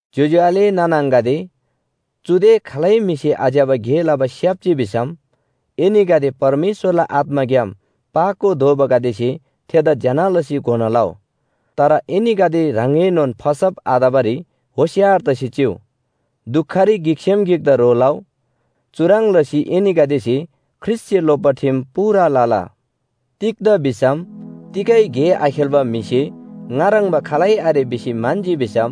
ज्‍योज्‍यो आले नाना आङागदे, चुदे खालै म्‍हिसे आज्‍यबा गे लबा स्‍याप्‍जी भिसम एनीगदे परमेश्‍वरला आत्‍माग्‍याम पाको दोबागदेसे थेदा ज्‍यना लसी घोना लउ। तर एनीगदे ह्राङएनोन फसब आतबारी होशियार तसी चिउ। दुखरी गिकसेम गिकदा ह्रो लउ। चुह्रङ् लसी एनीगदेसे ख्रीष्‍टसे लोप्‍बा ठिम पूरा लला। तिग्‍दा भिसम तिगै गे आखेल्‍बा म्‍हिसे ङा ह्रङ्‌बा खालै आरे भिसी म्‍हन्‍जी भिसम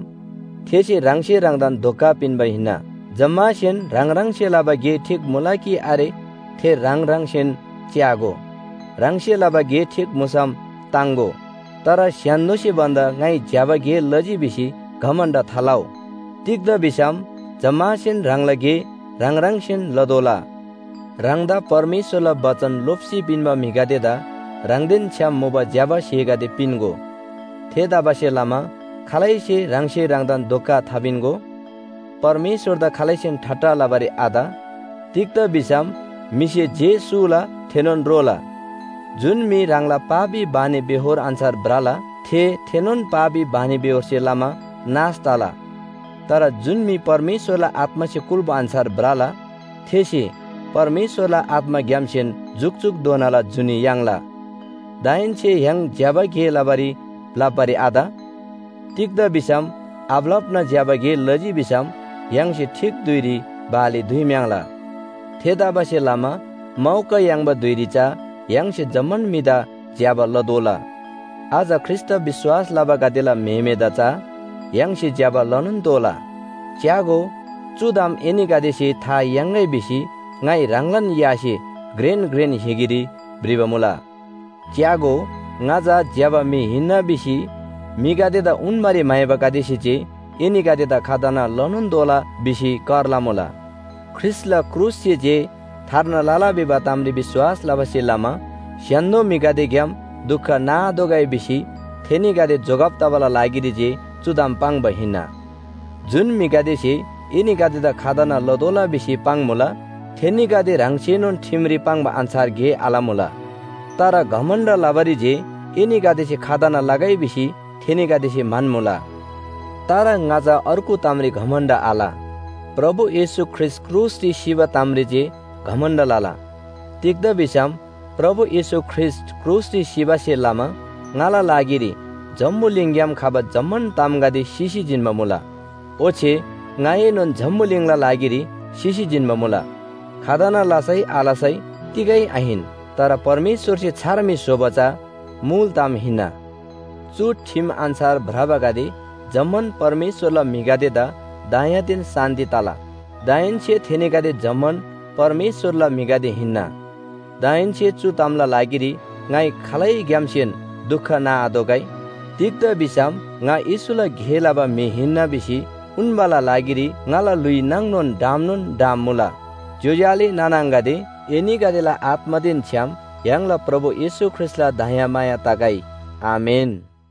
थेसे ह्राङसे ह्राङदान धोका पिन्‍बा हिन्‍ना। जम्‍मासेन ह्राङ ह्राङसे लबा गे ठीक मुला कि आरे थे ह्राङ ह्राङसेन च्‍यागो। ह्राङसे लबा गे ठीक मुसम ताङ्‍गो। तर स्‍य्‍हान्‍दोसे भन्‍दा ङाइ ज्‍यबा गे लजी भिसी घमण्‍ड थालउ। तिग्‍दा भिसम जम्‍मासेन ह्राङला गे ह्राङ ह्राङसेन लतोःला। ह्राङदा परमेश्‍वरला बचन लोप्‍सी पिन्‍बा म्‍हिगदेदा ह्राङदेन छ्‌याम मुबा ज्‍यबा स्‍हेगदे पिन्‍गो। थेतबासेलमा खालैसे ह्राङसे ह्राङदान धोका थापिन्‍गो। परमेश्‍वरदा खालैसेन ठट्टा लबारी आत। तिग्‍दा भिसम म्‍हिसे जे सूला थेनोन रोला। जुन म्‍हि ह्राङला पापी बानीबेहोर अन्‍छार भ्रला, थे थेनोन पापी बानीबेहोरसे लमा नाश तला। तर जुन म्‍हि परमेश्‍वरला आत्‍मासे कुल्‍बा अन्‍छार भ्रला, थेसे परमेश्‍वरला आत्‍माग्‍यामसेन जुकजुकधोनाला जुनी याङ्ला। दाहेन्‍से य्‍हाङ ज्‍यबा गे लबारी भ्‍लप्‍बारी आत। तिग्‍दा भिसम आभ्‍लप्‍ना ज्‍यबा गे लजी भिसम य्‍हाङसे ठीक धुइरी बाली दुइम्‍याङ्ला। थेतबासेलमा मौका याङ्बा धुइरी चा य्‍हाङसे जम्‍मान म्‍हिदा ज्‍यबा लतोःला। अझ ख्रीष्‍टदा विश्‍वास लबागदेला म्‍हेमेदा चा य्‍हाङसे ज्‍यबा लनोन तोःला। च्‍यागो, चु ताम एनीगदेसे था याङ्‌गै भिसी ङाइ ह्राङलान यासे घ्रेन घ्रेन हिगीरी भ्रिबा मुला। च्‍यागो, ङा चा ज्‍यबा म्‍हि हिन्‍ना भिसी म्‍हिगदेदा उन्‍बारी म्‍हाइबागदेसे जे एनीगदेदा खतना लनोन तोःला भिसी कर लमुला। ख्रीष्‍टला क्रुससे जे थार्ना लला भिबा तामरी विश्‍वास लबासे लमा स्‍य्‍हान्‍दो म्‍हिगदेग्‍याम दुख नाआतोःगै भिसी थेनीगदे जोगब तबाला लागिरी जे चु ताम पाङ्बा हिन्‍ना। जुन म्‍हिगदेसे एनीगदेदा खतना लतोःला भिसी पाङ्‌मुला थेनीगदे ह्राङसेनोन ठिमरी पाङ्बा अन्‍छार गे आलमुला। तर घमण्‍ड लबारी जे एनीगदेसे खतना लगै भिसी थेनीगदेसे म्‍हन्‍मुला। तर ङा चा अर्गु तामरी घमण्‍ड आल, प्रभु येशू ख्रीष्‍ट क्रुसरी सिबा तामरी जे घमण्‍ड लला। तिग्‍दा भिसम प्रभु येशू ख्रीष्‍ट क्रुसरी सिबासे लमा ङाला लागिरी जम्‍बुलिङग्‍याम खबा जम्‍मान तामगदे सिसी जिन्‍बा मुला, ओच्‍छे ङाएनोन जम्‍बुलिङला लागिरी सिसी जिन्‍बा मुला। खतना लसै आलसै तिगै आहिन, तर परमेश्‍वरसे छार म्‍हि स्‍होबा चा मुल ताम हिन्‍ना। चु ठिम अन्‍छार भ्रबागदे जम्‍मान परमेश्‍वरला म्‍हिगदेदा दयादेन शान्‍ति तला। दाहेन्‍से थेनीगदे जम्‍मान परमेश्‍वरला म्‍हिगदे हिन्‍ना। दाहेन्‍से चु तामला लागिरी ङाइ खालैग्‍यामसेन दुख नाआतोःगै। तिग्‍दा भिसम ङा येशूला गे लबा म्‍हि हिन्‍ना भिसी उन्‍बाला लागिरी ङाला ल्‍हुइ नाङ डामनोन डाम मुला। ज्‍योज्‍यो आले नाना आङागदे, एनीगदेला आत्‍मादेन छ्‌याम य्‍हाङला प्रभु येशू ख्रीष्‍टला दयामाया तगै। आमेन।